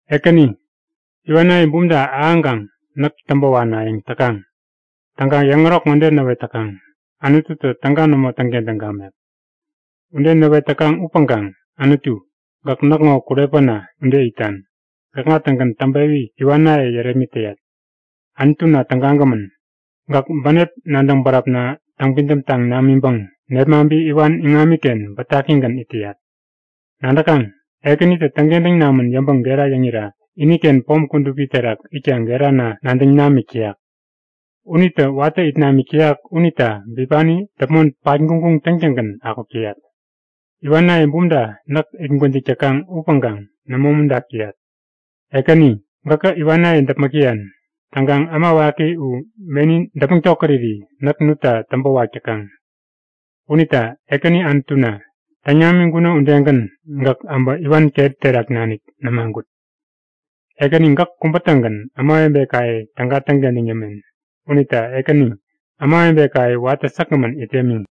Ekäni, iwanaye bumta ahäŋkaŋ näk täŋpä wanayäŋ täkaŋ. Täŋkaŋ yäŋärok ŋode näwet täkaŋ; Anututä täga nämo täŋkentäŋ gamek. Ude näwet täkaŋ upäŋkaŋ Anutu gäk näkŋo kurepäna ude itan. Gäkŋa-tägän täŋpewi iwanaye yärepmit täyat. Anutuna tägagämän, gäk bänep nadäŋ bäräpna täŋpidäm taŋ namiŋpäŋ nepmaŋpi iwan iŋamiken bätakigän it täyat. Nadäkaŋ? Ekänitä täŋkentäŋ namän yäŋpäŋ gera yäŋira iniken pom kudupi terak itkaŋ gerana nadäŋ namik täyak. Unitä watä it namik täyak unita bipani däpmon patguŋguŋ täŋtäŋgän akuk täyat. Iwanaye bumta näk it gwäjik täkaŋ upäŋkaŋ nämo umuntak täyat. Ekäni, gäkä iwanaye däpmäk täyan. Täŋkaŋ äma waki u meni däpmäŋ tokäriri näk nutta täŋpä wak täkaŋ. Unita Ekäni Anutuna, täŋ namiŋkuno udegän, gäk äbä iwan keri terak nanik nämagut! Ekäni gäk kubä-tägän ämawebekaye täga täŋkentäŋ yämen. Unita Ekäni, ämawebekaye watä säkgämän it yämi.